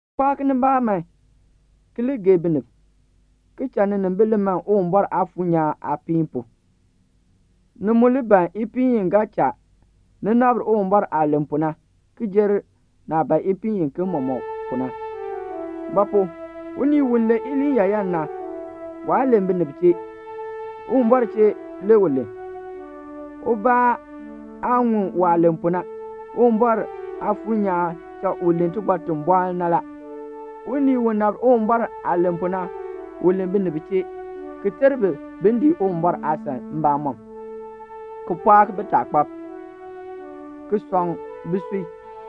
Pɔɔk nibaa man ki li gee binib, ki cha ninimbil li man Uwumbɔr Aafuur nyaan aapiin pu; ni mu li ban ipiin i ga cha ni nabr Uwumbɔr aah len pu na, ki jer naah ban ipiin iken mɔmɔk pu na. Ba pu? unii u len iliin yaayan na, waa len binib chee, Uwumbɔr chee le u len; ubaa aa ŋun waah len pu na. Uwumbɔr Aafuur nyaan cha u len tibɔr ti bɔɔ na la. Unii u nabr Uwumbɔr aah len pu na, u len binib chee, ki ter bi bin dii Uwumbɔr aasan mbamɔm, ki pɔɔk bitaakpab, ki sɔŋ bisui.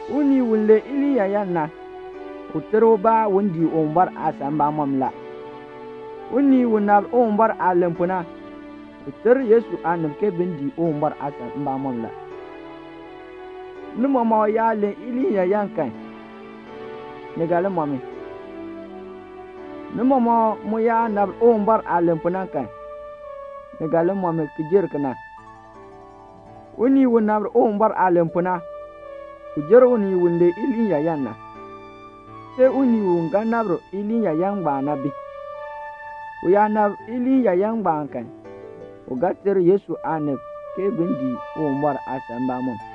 Unii u len iliin yaayan na, u ter ubaa un dii Uwumbɔr aasan mbamɔm la. Unii u nabr Uwumbɔr aah len pu na, u ter Yesu aanib ke bin dii Uwumbɔr aasan mbamɔm la. Ni mɔmɔk yaa len iliin yaayan kan, ni ga li mɔ mi; ni mɔmɔk mu yaa nabr Uwumbɔr aah len pu na kan, ni ga li mɔ mi ki jer kena. Unii u nabr Uwumbɔr aah len pu na, u jer unii u len iliin yaayan na, see unii u ga nabr iliin yaayan ngbaan na bi. U yaa nabr iliin yaayan ngbaan kan, u ga ter Yesu aanib ke bin dii Uwumbɔr aasan mbamɔm.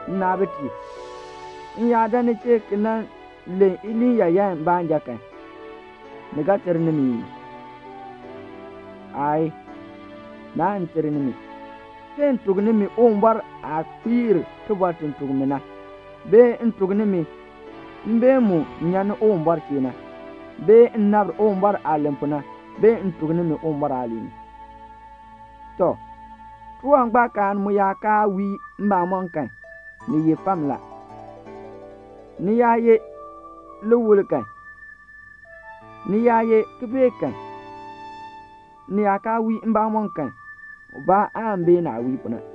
Nnaabitiib, m yaa dan ni chee ki nan len iliin yaayan baanja kan, ni ga ter nimi ii? Aayii. Naan ter nimi, see m tuk nimi Uwumbɔr aah kpiir tibɔr ti tuk mi na, bee m tuk nimi mbeen mu nyan ni Uwumbɔr chee na, bee m nabr Uwumbɔr aah len pu na, bee m tuk nimi Uwumbɔr aaliin. Tɔ, tiwangbaakaan mu yaa kaa wii mbamɔm kan, ni ye fam la. Ni yaa ye liwul kan, ni yaa ye kibeek kan, ni yaa kaa wii mbamɔm kan, ubaa aan bee naah wii pu na.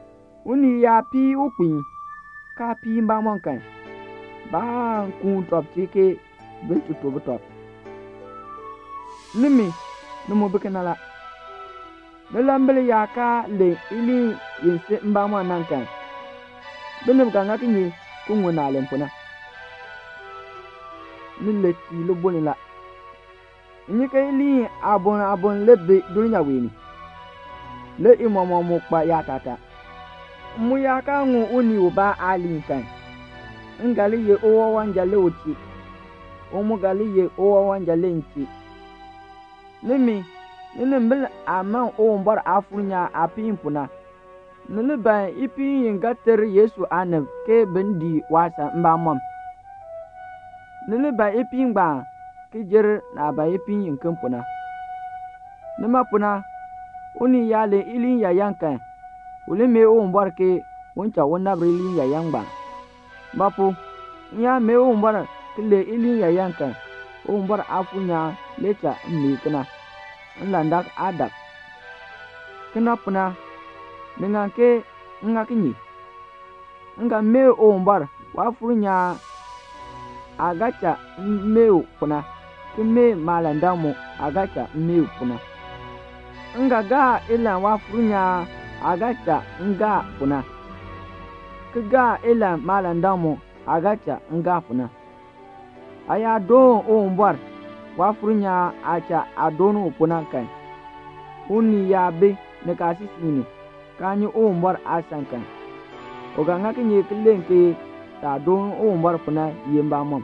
Unii yaa pii ukpiin, kaa pii mbamɔm kan, baan kuun tɔb chee ke bin ti to butɔb. Nimi, ni mu bi kena la. Nilambil yaa kaa len iliin i si mbamɔm na kan, binib ga ŋa kinye ki ŋun naah len pu na? Ni len tii libuln la. M nyi ke iliin aaboŋ aaboŋ le bi dulnyaa wee ni, le i mɔmɔk mu kpa yaatataa. M mu yaa kaa ŋun unii ubaa aaliin kan, m ga li ye uwawanja le u chee, u mu ga li ye uwawanja le m chee. Nimi, ninimbil aah man Uwumbɔr Aafuur nyaan aapiin pu na, ni li ban ipiin i ga ter Yesu aanib ke bin dii waasan mbamɔm. Ni li ban ipiin ngbaan ki jer naah ban ipiin iken pu na. Nima pu na, unii yaa len iliin yaayan kan, u li mee Uwumbɔr ke un cha u nabr iliin yaayan ngbaan. Ba pu? m yaa mee Uwumbɔr ki len iliin yaayan kan, Uwumbɔr Aafuur nyaan le cha m mee kena, nlandak aa dak. Kena pu na, ni ŋan ke m ŋa kinye? M ga mee Uwumbɔr, Waafuur nyaan aah ga cha m mee pu na, ki mee maalandak mu aah ga cha m mee pu na. M ga gaa ilahn Waafuur nyaan aah ga cha m gaa pu na, ki gaa ilahn maalandak mu aah ga cha m gaa pu na. Aa yaa doon Uwumbɔr, Waafuur nyaan aah cha aa doon u pu na kan, unii yaa bi nikaasisik ni, kaa nyi Uwumbɔr aasan kan, u ga ŋa kinye ki len ke saah doon Uwumbɔr pu na ye mbamɔn;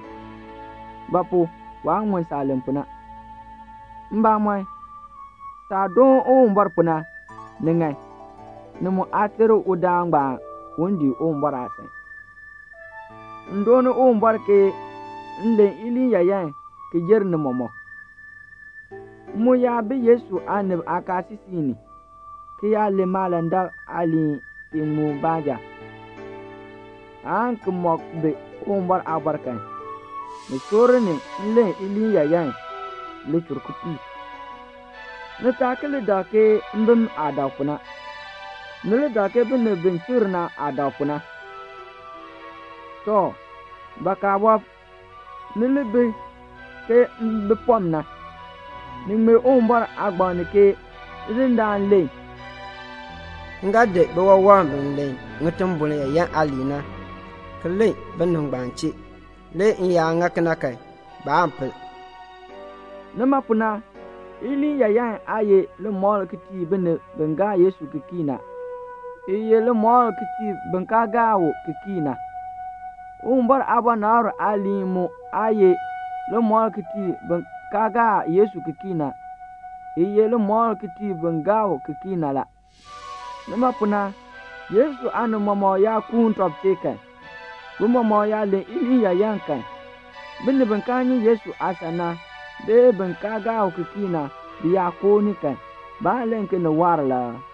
ba pu? waa ŋun saah len pu na. Mbamɔn, saah doon Uwumbɔr pu na, ni ŋan, ni mu aa ter udaan ngbaan un dii Uwumbɔr aasan. M dooni Uwumbɔr ke m len iliin yaayan ki jer ni mɔmɔk. M mu yaa bi Yesu aanib aakaasisik ni, ki yaa len maalandak aaliin iŋmu baanja, aan ki mɔk bi Uwumbɔr aabɔr kan, ni soor ni m len iliin yaayan lichur kipiik. Nnaabitiib, ni taa ki li dak ke mbim aah dak pu na. Ni li dak ke binib bi chikr na aah dak pu na. Tɔ, bakaa wɔb, ni li bi ke mbipɔm na. Ni ŋmee Uwumbɔr aagbaŋ ni ke Tidindaan len, "M ga di biwawam bi len ŋitimbol yaayan aaliin na, ki len binib ngbaan chee, le m yaa ŋa kena kan, baan pel." Nima pu na, iliin yaayan aa ye limɔkl ki tii binib bi gaa Yesu ki kii na; i ye limɔkl ki tii bin kaa gaa u ki kii na. Uwumbɔr aabɔnabr aaliin mu aa ye limɔkl ki tii bin kaa gaa Yesu ki kii na; i ye limɔkl ki tii bin gaa u ki kii na la. Nima pu na, Yesu aanib mɔmɔk yaa kuun tɔb chee kan, bi mɔmɔk yaa len iliin yaayan kan, binib bi kaa nyi Yesu aasan na, bee bin kaa gaa u ki kii na, bi yaa koo ni kan, baan len ke ni waar la aa?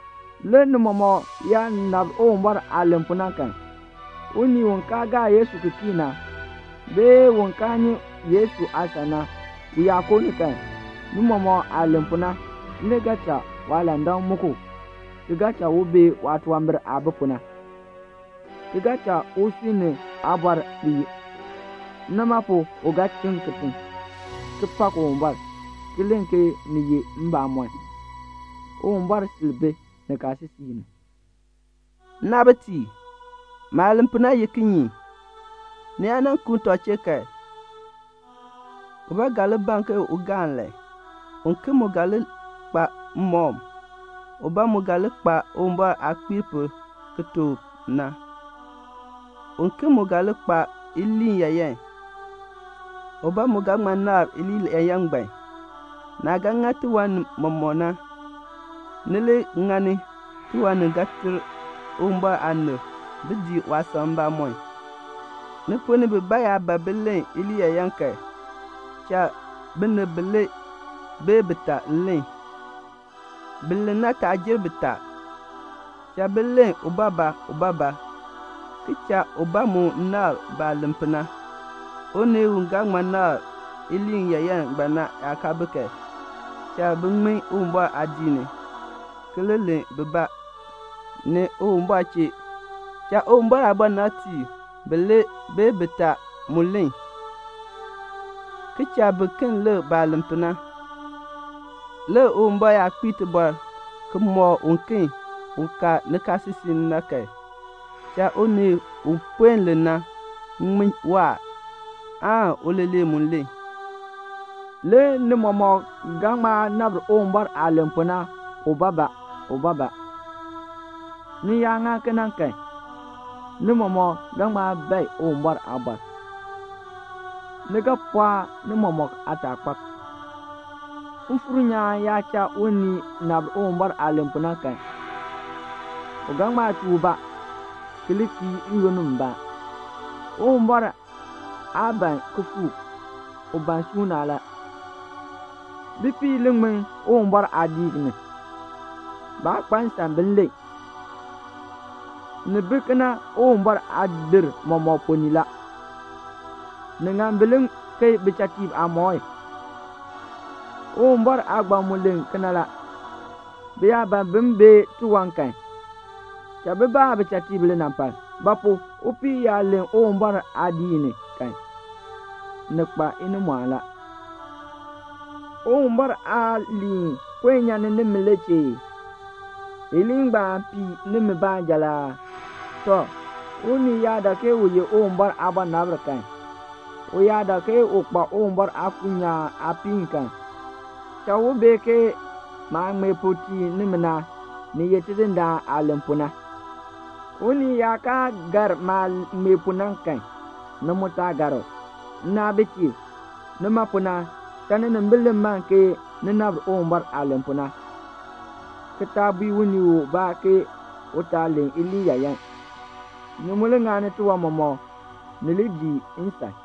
Le ni mɔmɔk yaa nabr Uwumbɔr aah len pu na kan, unii u kaa gaa Yesu ki kii na, bee un kaa nyi Yesu aasan na, u yaa koo ni kan, ni mɔmɔk aah len pu na le ga cha waalandak muk u, ki cha u bee waatunwambir aah bi pu na, ki cha usui ni aabɔr kpiir. Nima pu u ga chiŋ kitiŋ, ki pak Uwumbɔr, ki len ke ni ye mbamɔn, Uwumbɔr sil bi nikaasisik ni. Nnaabitiib, maah len pu na ye kinye? Ni yaa nan kuun tɔb chee kan, ubaa ga li ban ke un gaa nlahn, uken mu ga li kpa mmɔkm, ubaa mu ga li kpa Uwumbɔr aah kpiir pu ki tuk u na, uken mu ga li kpa iliin yaayan, ubaa mu ga ŋma nabr iliin yaayan ngbaan. Naah ga ŋa tiwan mɔmɔk ni na, ni li ŋani tiwan ni ga ter Uwumbɔr aanib bin dii waasan mbamɔm. Ni ponn ni bibaa yaa ban bin len iliin yaayan kan, cha binib bilee bee titaa len. Bin len na taa jer bitaa. Cha bi len ubaabaa ubaabaa, ki cha ubaa mu nabr baah len pu na. Unii u ga ŋma nabr iliin yaayan ngbaan na yaa kaa bi kan, cha bin ŋmin Uwumbɔr aadiik ni, ki li len bibaa ni Uwumbɔr chee. Cha Uwumbɔr aabɔnabtiib bilee bee bitaa mu len, ki cha biken lik baah len pu na. Le Uwumbɔr yaa kpiir tibɔr ki mɔk uken u ka nikaasisik ni na kan, cha unii u puen len na ŋmin waahr, aan uleeler mu len. Le ni mɔmɔk ga ŋma nabr Uwumbɔr aah len pu na ubaabaa ubaabaa. Ni yaa ŋa kena kan, ni mɔmɔk ga ŋma bae Uwumbɔr aabɔr. Ni ga pɔɔk ni mɔmɔk aataakpab. Mfuur nyaan yaa cha unii nabr Uwumbɔr aah len pu na kan, u ga ŋma chuu ubaa ki li kii n-yoonn mbaa. Uwumbɔr aa ban kifuuk, u ban suuna la. Bipiib li ŋmin Uwumbɔr aadiik ni. Baa kpa nsan bin len. Ni bi kena Uwumbɔr aadir mɔmɔk ponn ni la. Ni ŋan bi li keei bichatiib aamɔi. Uwumbɔr aagbaŋ mu len kena la. Bi yaa ban bin bee tiwan kan, cha bi baa bichatiib linampal. Ba pu? upii yaa len Uwumbɔr aadiik ni kan, ni kpa inimɔɔn la. Uwumbɔr aaliin puen nyan ni nimi le chee ee? Iliin ngbaan pii nimi baanja la aa? Tɔ, unii yaa dak ke u ye Uwumbɔr aabɔnabr kan, u yaa dak ke u kpa Uwumbɔr Aafuur nyaan aapiin kan, cha u bee ke maah ŋmee pu tii nimi na, ni ye Tidindaan aah len pu na. Unii yaa kaa gar maah ŋmee pu na kan, ni mu taa gar u. Nnaabitiib, nima pu na, cha ninimbil li man ke ni nabr Uwumbɔr aah len pu na, ki taa bui unii ubaa ke u taa len iliin yaayan. Ni mu li ŋani tiwan mɔmɔk ni li dii nsan.